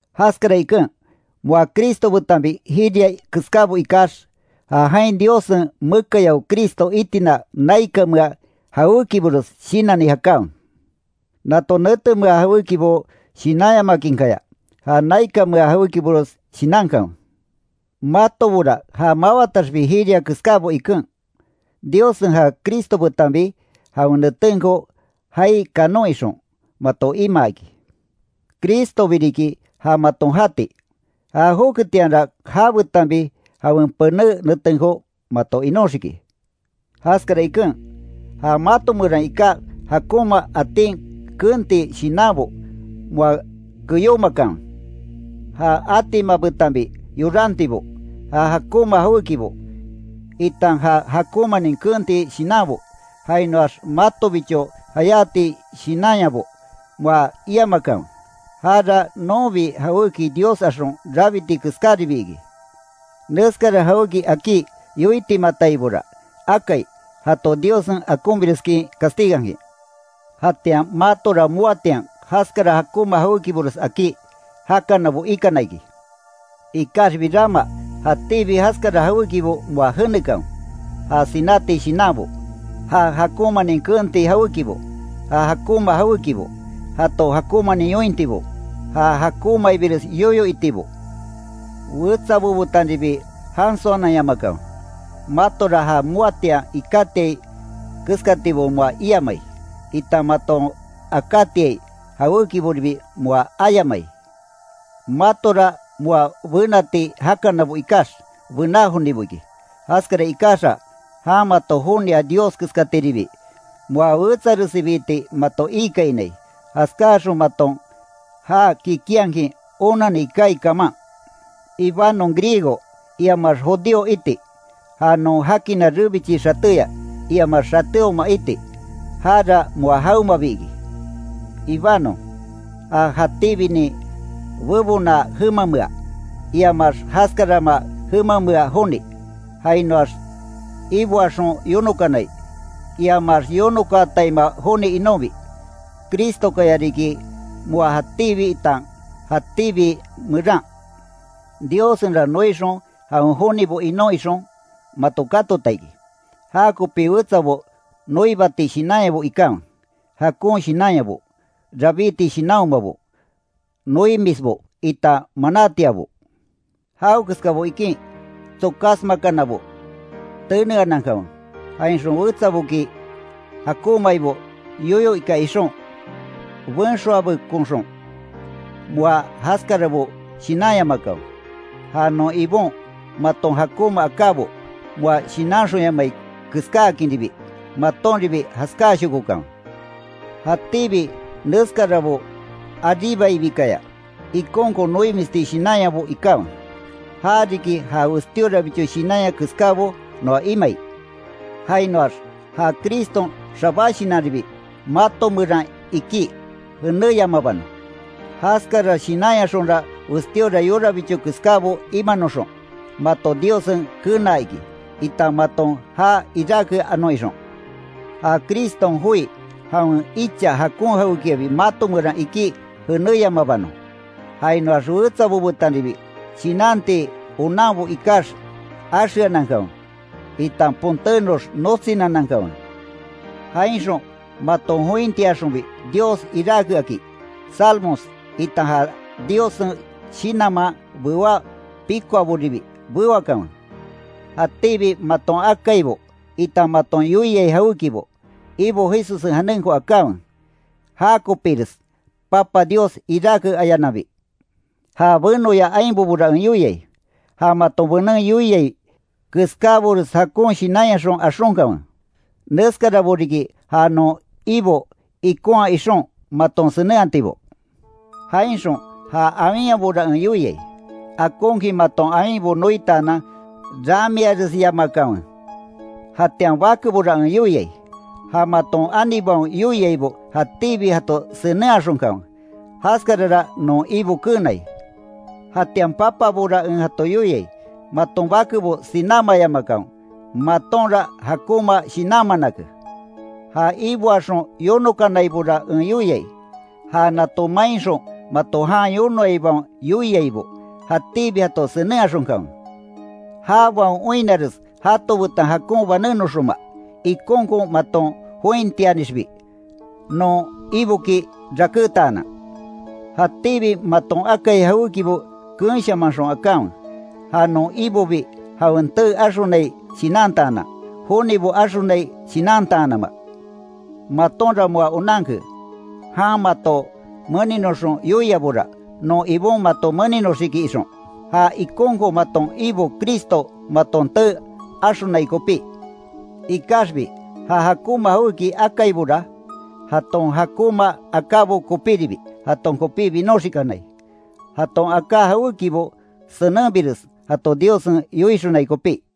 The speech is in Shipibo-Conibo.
Jaskara iken, moa Cristo betanbi jiria keskábo ikax, ja jain Diossen mekayao Cristo itina naikanmea jawékibores shinanni, jakanwe. Nato netemea jawékibo shinanyamakinkaya, ja naikanmea jawékibores shinankanwe. Matobora ja mawataxbi jiria keskábo iken, Diossen ja Cristo betanbi jawen netenko jaai kanon ixon, mato imaa iki. Cristobi riki ja maton jati, já joketianra jabetanbi jawen pené netenko mato inóxiki. Jaskara iken, ja mato meran iká jakonma atin keenti shinanbo moa keyómakanwe. Ja atima betanbi yorantibo, ja jakonma jawékibo, itan ja jakonmanin keenti shinanbo, jainoax matobicho jayáti shinanyabo moa iamakanwe, jara nonbi jawéki dios axon rabiti keskáribi iki. Neskara jawéki akí yoitimataibora akai, jato Diossen akonbireskin castigankin. Jatian matora moatian jaskara jakonma jawékibores akí, jakanabo ikana iki. Ikaxbi rama jatíbi jaskara jawékibo moa jenekanwe; ja sináti shinanbo; ja jakonmanin keenti jawékibo; ja jakonma jawékibo; jato jakonmanin yointibo; ja jakonmaibires yoyo itibo, wetsabo betanribi jansoananyamakanwe, matora ja moatian ikátiai keskatibo moa iamai, itan maton akátiai jawékiboribi moa ayamai. Matora moa bénati jakanabo ikax, bená jonibo iki, jaskara ikaxa jan mato jonia Dios keskatiribi, moa wetsaresibiti mato iikainai, jaskáaxon maton já kikinhakin onani kaai kaman. Ibanon griego, iamax judío iti, ja non jakina rebichi xatéya, iamax xatéoma iti, jara moa jawemabi iki. Ibanon, ja jatíbinin bebona jemamea, iamaax jaskarama jemamea joni, jainoax iboaxon yonokanai, iamax yonokaataima joni inonbi; Cristokaya riki moa jatíbi itan jatíbi meran. Diossenra noixon jawen jonibo inon ixon, mato katota iki, jakopi wetsabo noibati shinanyabo ikanwe, jakon shinanyabo, rabíti shinanhomabo, noimisbo itan manatiabo. Jawekeskabo ikin tsokásmakanabo teneanankanwe; jainxon wetsaboki jakonmaibo yoyo ika ixon, benxoabekonxon moa jaskarabo shinanyamakanwe. Ja non Ibon maton jakonma akábo moa shinanxonyamai keskáakinribi, matonribi jaskáashokokanwe. Jatíbi neskarabo aríbaibikaya, ikonkon noimisti shinanyabo ikanwe, ja riki ja westíorabicho shinanya keskábo noa imai. Jainoax ja Criston xabá shinanribi mato meran ikí, jenéyamabanon. Jaskara shinanyaxonra westíora yorabicho keskábo imanoxon, mato Diossen kenaa iki, itan maton já iráke anon ixon. Ja Criston joi jawen icha jakon jawékiabi mato meran ikí jenéyamabanon. Jainoax wetsabo betanribi shinanti onanbo ikax axeanankanwe, itan ponténox notsinanankanwe. Jainxon maton jointiaxonbi Dios iráke aki, salmos, itan ja Diossen shinanman bewá pikoaboribi, bewakanwe. Jatíbi maton akaibo itan maton yoiai jawékibo, Ibo Jesussen janenko akanwe, já kopires Papa Dios iráke ayananbi. Ja benoya ainbobora en yoiai, ja maton benen yoiai keskábores jakon shinanyaxon axonkanwe, neskarabo riki ja non Ibo ikonhaa ixon, maton senenhatibo. Jainxon ja awinyabora en yoiai, akonkin maton awinbo noitaanan ramiaresyamakanwe. Jatian bakebora en yoiai, ja maton anibaon yoiaibo jatíbi jato senenhaxonkanwe, jaskarara non Ibo keenai. Jatian papabora en jato yoiai, maton bakebo sinámayamakanwe, matonra jakonma shinanmanake. Ja iboaxon yonokanaibora en yoiai, ja nato mainxon mato jan yonoaibaon yoiaibo, jatíbi jato senenhaxonkanwe; jabaon oinnares jato betan jakon banénoxonma, ikonkon maton jointianixbi, non Iboki rakétaanan. Jatíbi maton akai jawékibo keenshamanxon akanwe, ja non Ibobi jawen tee axonai shinantaanan, jonibo axonai shinantaanama. Matonra moa onanke, jan mato meninoxon yoiabora, non Ibon mato meninoxiki ixon. Ja ikonkon maton Ibo Cristo maton tee axonai kopí, ikaxbi ja jakonma jawéki akaibora, jaton jakonma akábo kopíribi, jaton kopí binoxikanai. Jaton aká jawékibo senenbires jato Diossen yoixonai kopí.